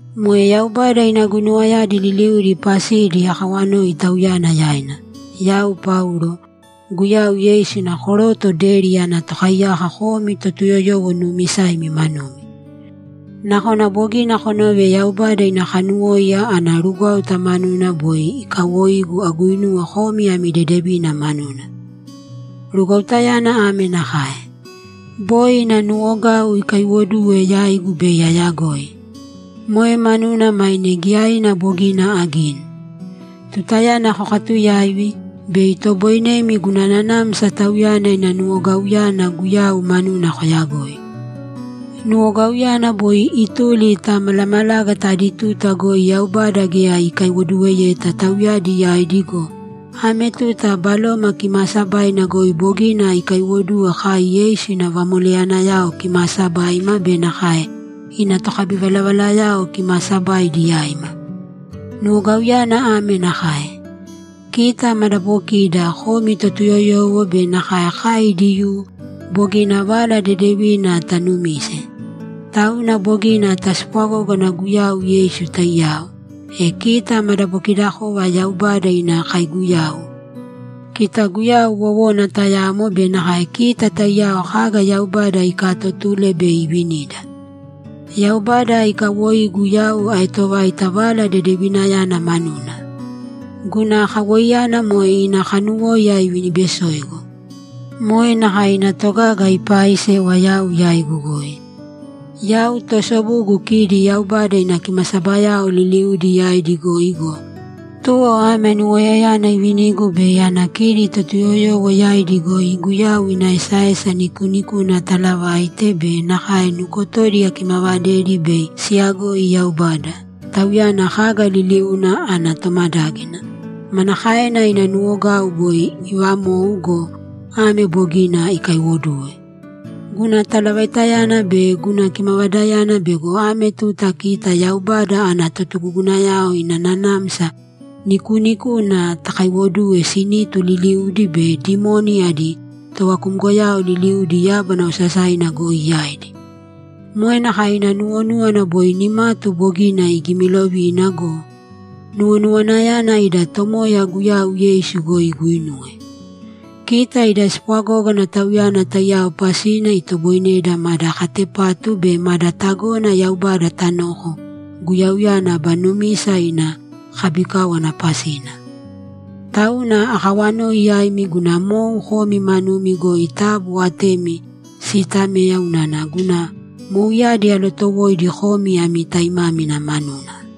Moe Yaubada ina guinuwayadi liliudi pasidi akawanoi Tauyana yaina. Yau Paulo, Guyau Yeisu ina koroto deri ana tokaiyako komi Totuyoyowo nuumisaimi manumi. Nakona bogina konove Yaubada ina kanuwóiya ana rugwáuta manuna boi ikawoigu aguinuwe komi ami dedevina manuna. Rugwautayana ame nakae: Boi ina nuwogau ikaiwoduwe yaigu bei ayagoi. Moe manuna maine giyaina bogina agini. Tutayana kokatuyaivi, bei itoboinemi guna nanamsa Tauyana ina nuwogauyana Guyau manuna koyagoi. Nuwogauyana boi ituli ta malamalágata adi tuta goi Yaubada geya ikaiwoduweyeta tauyadi yaidi go, ame tuta Baloma Kimaasabaina goi bogina ikaiwoduwe kai Yeisu ina vamoleyanayao kimaasabaima be nakae ina tokabivalavalayao kimaasabaidi yaima. Nuwogauyana ame nakae: Kita madabokida, komi Totuyoyowo be nakae kai Diyuu, bogina Vala Dedevina tanumise. Tauna bogina taspwagógana Guyau Yeisu taiyao, e kita madabokidakova Yaubada ina kaiguyau, kita Guyau wowona tayamo be nakae kita taiyao kaga Yaubada ikaatotule bei ivinida. Yaubada ikawoigu yau aetovaita Vala Dedevinayana manuna. Guna kawoiyana moe ina kanuwóiya ivinibesoigu. Moe nakae ina togaga ipaaisewa yau yaigu goi. Yau toosobugu kidi Yaubada ina kimasabayao liliudi yaidi goi go, tuwo ame anuwoiyayana iivinigu bei ana kidi Totuyoyowo yaidi goi Guyau ina esaesa nikuunikuna atalavaite be nakae nukotodi akimavadedi bei siyagoi Yaubada, Tauyana kaga liliuna ana tomadágina, manakaena ina nuwogau boi iivamou go, ame bogina ikaiwoduwe. Guna talavaitayana be guna kimavadayana bego ame tuta kita Yaubada ana totugugunayao ina nanamsa nikuunikuna takaiwoduwe sinitu liliudi be dimoni adi tovakumgoyao liliudi yábana osasaina goi yaidi. Moe nakae ina nuwonúwana boi nimatu bogina igimilovina go, nuwonuwanayana ida Tomoya Guyau Yeisu goi iguinuwe. Kita ida spwagógana Tauyana taiyao pasina itoboineda mada katepatu be mada tagona Yaubada tanoko Guyauyana aba numisa ina kabikáwana pasina. Tauna akawanoi yaimi guna mou komi manumi goi taabu atemi siitamēya unana guna mouyadi alootowoidi komi ami taimámina manuna.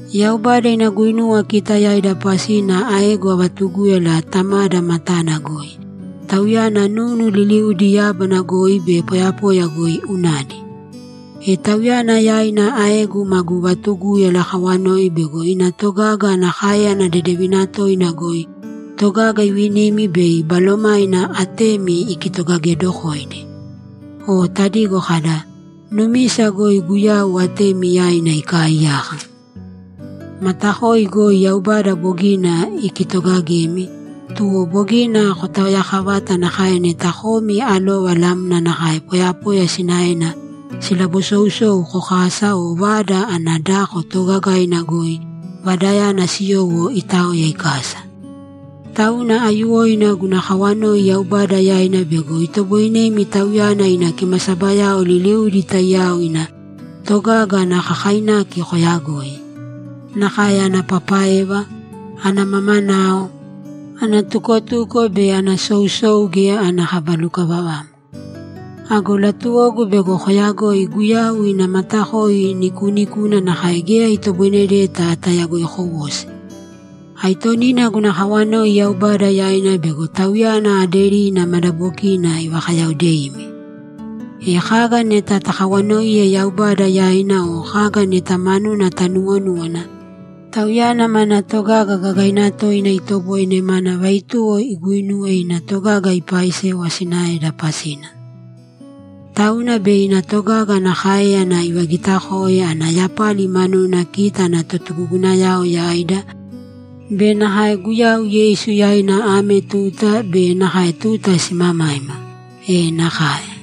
Yaubada ina guinuwa kita yaida pasina aegu avatugúyala Tamada matana goi; Tauyana nunu liliudi yábana goi be poyapoya goi unadi. E Tauyana yaina aegu magu vatugúyala akawanoi bego ina togaga ana káeyana dedevina toina goi togaga ivinimi bei Balomaina atemi ikitogagedokoidi. O tadigo kada, ‘Numisa goi Guyau atemi yaina ikaaiyaka.’ Matakoi goi Yaubada bogina ikitogagemi, tuwo bogina kotaoyakavata nakae neta komi alova lamna nakae poyapoya sinaena silabasousou kokasa o vada ana dako toogagaina goi vadayana siyowo itaoya ikasa. Tauna aiyuwoina guna kawanoi Yaubada yaina bego itoboinemi Tauyana ina kimasabayao liliudi taiyao ina togaga ana kakainaki koyagoi. Nakae ana papaeva, ana mamanao, ana tukotuko be ana sousou geya ana kaba lukavavamo. Ago latuwogu bego koyagoi Guyau ina matakoi nikuunikuna nakae geya itoboinedeta tayagoikowosi. Aitonina guna kawanoi Yaubada yaina bego Tauyana aderina madabokina ivakayaodeimi. E kaga neta takawanoiye Yaubada yaina o kaga neta manuna tanuwonúwana, Tauyana mana togaga gagaina toina itoboine mana vaituwo iguinuwe ina togaga ipaaisewa sinaeda pasina. Tauna bei ina togaga ana káeyana ivagitakoe ana yapali manuna kita ana totugugunayao yaida be nakae Guyau Yeisu yaina ame tuta be nakae tuta simamaima! E nakae!